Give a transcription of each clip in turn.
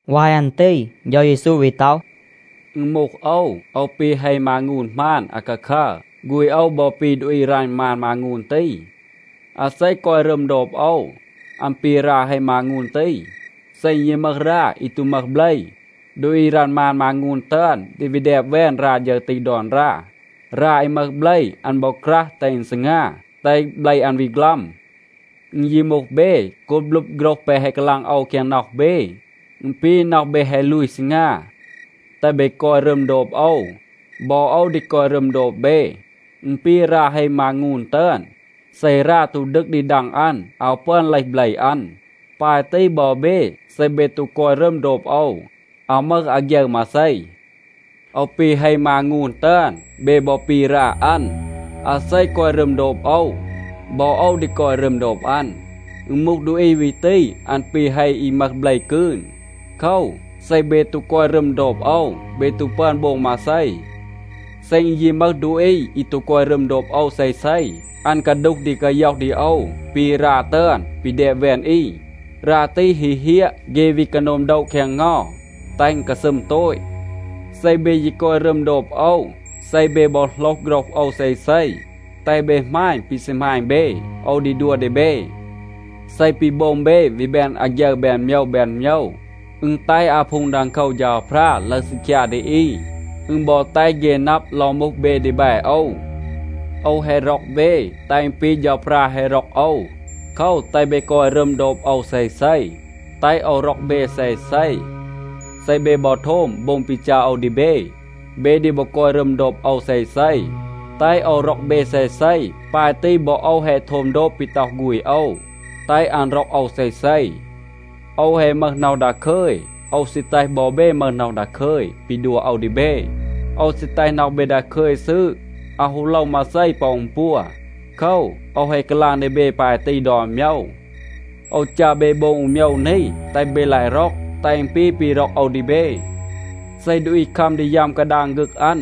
วาย อัน ตี เฌา เยซู วี ต็อห, “อึณ มูห โอว, โอว ปี เฮ มางูน หมาน อาคาคัร. ฆูณ โอว บอ ปี ดูอี รัณ มาน มางูน ตี. อาเซ กอย รึม โดบ โอว, อัน ปี รา เฮ มางูน ตี. เซ อึณ ยี มึห รา อี ตู มึห เบล, ดูอี รัณ มาน มางูน ตึอน ดี วี แดบ แวน รา ฌึร ตี ดอน รา. รา อี มึห เบล, อัน บอ ครัห แตห อึณ ซีงา, แตห เบล อัน วี ฆลัม. อึณ ยี มูห เบ, โกบ ลึบ โฆรห แปะ แฮะ กาลาง โอว แคง น็อห เบ, อึณ ปี, น็อห เบ แฮะ ลูย ซีงา. แตห เบ กอย รึม โดบ โอว. บอ โอว ดี กอย รึม โดบ เบ. อึณ ปี รา เฮ มางูน ตึอน. เซ รา ตู ดึก ดี ดัง อัน อาว ปึอน เลห เบล อัน. ปาย ตี บอ เบ, เซ เบ ตู กอย รึม โดบ โอว, อาว มึห อาฆยึร มาเซ. โอว ปี เฮ มางูน ตึอน. เบ บอ ปี รา อัน. อาเซ กอย รึม โดบ โอว, บอ โอว ดี กอย รึม โดบ อัน. อึณ มูห ดูอี วี ตี, อัน ปี เฮ อี มึห เบล กืน. โคว, เซ เบ ตู กอย รึม โดบ โอว, เบ ตู ปึอน โบง มาเซ. เซ อึณ ยี มึห ดูอี อี ตู กอย รึม โดบ โอว เซเซ, อัน กาดูห ดี กาย็อห ดี โอว ปี รา ตึอน ปี แดบ แวน อี. รา ตี ฮี เฮียะ, เฆ วี กาโนม โดะ แคง เงา, แตห อึณ กาซึม โตต. เซ เบ ยี กอย รึม โดบ โอว, เซ เบ บอ โหลห โฆรห โอว เซเซ, แตห เบ หมาณ ปี ซี หมาณ เบ. โอว ดี ดัว ดี เบ. เซ ปี โบง เบ วี แบน อาฆยึร แบน โมยว แบน โมยว, อึณ แตห อาพูง ดังโคว เฌาพรา ลึห ซีคยา ดี อี, อึณ บอ แตห เฆ นับ ลอง มูห เบ ดีแบ โอว. โอว แฮะ ร็อก เบ, แตห อึณ ปี เฌาพรา แฮะ ร็อก โอว. โคว, แตห เบ กอย รึม โดบ โอว เซเซ, แตห โอว ร็อก เบ เซเซ. เซ เบ บอ โทม โบง ปี จัร โอว ดี เบ, เบ ดี บอ กอย รึม โดบ โอว เซเซ, แตห โอว ร็อก เบ เซเซ. ปาย ตี บอ โอว แฮะ โทม โดบ ปี ต็อห ฆูณ โอว, แตห อัน ร็อก โอว เซเซ. โอว แฮะ มึห น็อห ดาคึย. โอว ซี แตห บอ เบ มึห น็อห ดาคึย ปี ดัว โอว ดี เบ. โอว ซี แตห น็อห เบ ดาคึย ซืด, อาว ฮู โลว มาเซ ปอ อึณ ปัว. โคว, โอว แฮะ กาลาง ดี เบ ปาย ตี ดอน โมยว. โอว จัร เบ โบง อู โมยว นี, แตห เบ ลาย ร็อก, แตห อึณ ปี ปี ร็อก โอว ดี เบ. เซ ดูอี คัม ดี ยัม กาดาง ฆึก อัน,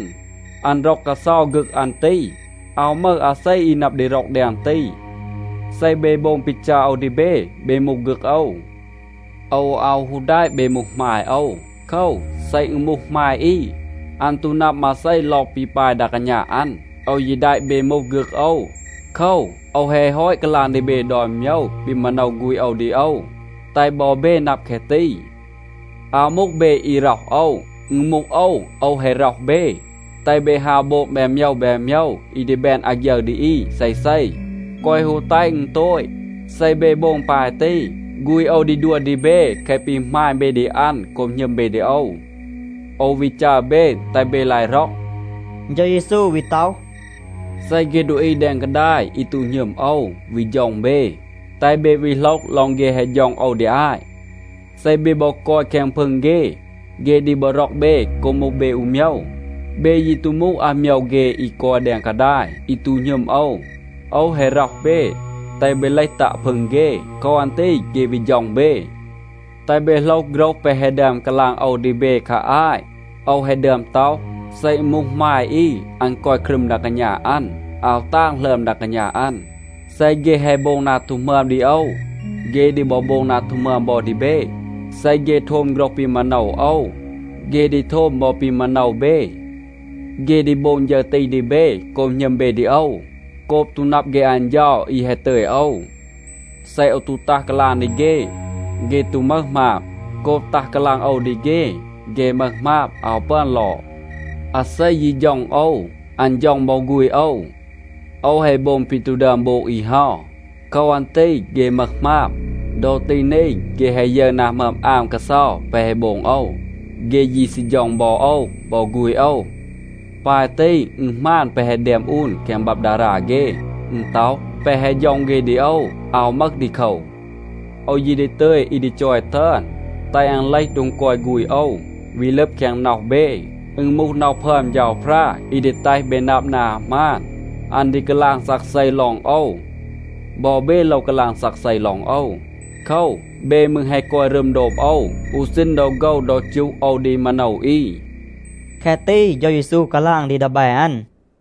อัน ร็อก กาเซา ฆึก อัน ตี. อาว มึห อาเซ อี นับ ดี ร็อก แดง ตี. เซ เบ โบง ปี จัร โอว ดี เบ, เบ มูห ฆึก โอว. โอว อาว ฮู แดะ เบ มูห หมาย โอว. โคว, เซ อึณ มูห หมาย อี, อัน ตู นับ มาเซ ลอง ปี ปาย ดา กาณา อัน. โอว ยี แดะ เบ มูห ฆึก โอว. โคว, โอว แฮะ ฮอต กาลาง ดี เบ ดอน โมยว ปี มาโนว ฆูณ โอว ดี โอว, แตห บอ เบ นับ แคะ ตี. อาว มูห เบ อี ร็อห โอว. อึณ มูห โอว, โอว แฮะ ร็อห เบ, แตห เบ ฮาว โบง แบน โมยว แบน โมยว อี ดี แบน อาฆยึร ดี อี เซเซ, แกวะ ฮู แตห อึณ โตต. เซ เบ โบง ปาย ตี, ฆูณ โอว ดี ดัว ดี เบ แคะ ปี หมาณ เบ ดี อัน โกบ หณึม เบ ดี โอว. โอว วี จัร เบ, แตห เบ ลาย ร็อก.” เฌา เยซู วี ต็อห, “เซ เฆ ดูอี แดง กาดาย อี ตู หณึม โอว วี ฌ็อง เบ, แตห เบ วี โหลห ลอง เฆ แฮะ ฌ็อง โอว ดี อาต. เซ เบ บอ กอย แคง พึง เฆ, เฆ ดี บอ ร็อก เบ โกบ มูห เบ อู โมยว. เบ ยี ตู มูห อาโมยว เฆ อี กอย แดง กาดาย, อี ตู หณึม โอว. โอว แฮะ ร็อห เบ, แตห เบ เลห ตัะ พึง เฆ. โคว อัน ตี เฆ วี ฌ็อง เบ. แตห เบ โหลห โฆรห แปะ แฮะ ดึอม กาลาง โอว ดี เบ คา อาต. โอว แฮะ ดึอม ต็อห, ‘เซ อึณ มูห หมาย อี, อัน กอย ครึม ดา กาณา อัน, อาว ตาง หลึอม ดา กาณา อัน.’ เซ เฆ แฮะ โบง นา ตู หมึอม ดี โอว, เฆ ดี บอ โบง นา ตู หมึอม บอ ดี เบ. เซ เฆ โทม โฆรห ปี มาโนว โอว, เฆ ดี โทม บอ ปี มาโนว เบ. เฆ ดี โบง ฌึร ตี ดี เบ โกบ หณึม เบ ดี โอว, โกบ ตู นับ เฆ อัน เฌา อี แฮะ ตึย โอว. เซ โอว ตู ตัห กาลาง ดี เฆ, เฆ ตู มึห หมาบ. โกบ ตัห กาลาง โอว ดี เฆ, เฆ มึห หมาบ, อาว ปึอน ลอด. อาเซ ยี ฌ็อง โอว, อัน ฌ็อง บอ ฆูณ โอว. โอว แฮะ โบง ปี ตู ดึอม โบง อี เฮา. โคว อัน ตี เฆ มึห หมาบ. ดอ ตี นี, เฆ แฮะ ยึร นา หมึอม อาม กาเซา แปะ แฮะ โบง โอว, เฆ ยี ซี ฌ็อง บอ โอว บอ ฆูณ โอว. ปาย ตี, อึณ หมาน แปะ แฮะ แดม อูน แคง บับ ดารา เฆ. อึณ ต็อห, ‘แปะ แฮะ ฌ็อง เฆ ดี โอว อาว มึห ดีโคว.’ โอว ยี ดี ตึย อี ดี จอย ตึอน, แตห อัน เลห โดง กอย ฆูณ โอว, วี ลึบ แคง น็อห เบ. อึณ มูห น็อห พึอม เฌาพรา, อี ดี แตห เบ นับ นา หมาน. อัน ดี กาลาง ซักเซ ลอง โอว. บอ เบ โลว กาลาง ซักเซ ลอง โอว. โคว, เบ มืร แฮะ กอย รึม โดบ โอว อู ซีณ ดอ โฆว ดอ จูห โอว ดี มาโนว อี.” แคะ ตี เฌา เยซู กาลาง ดี ดีแบ อัน.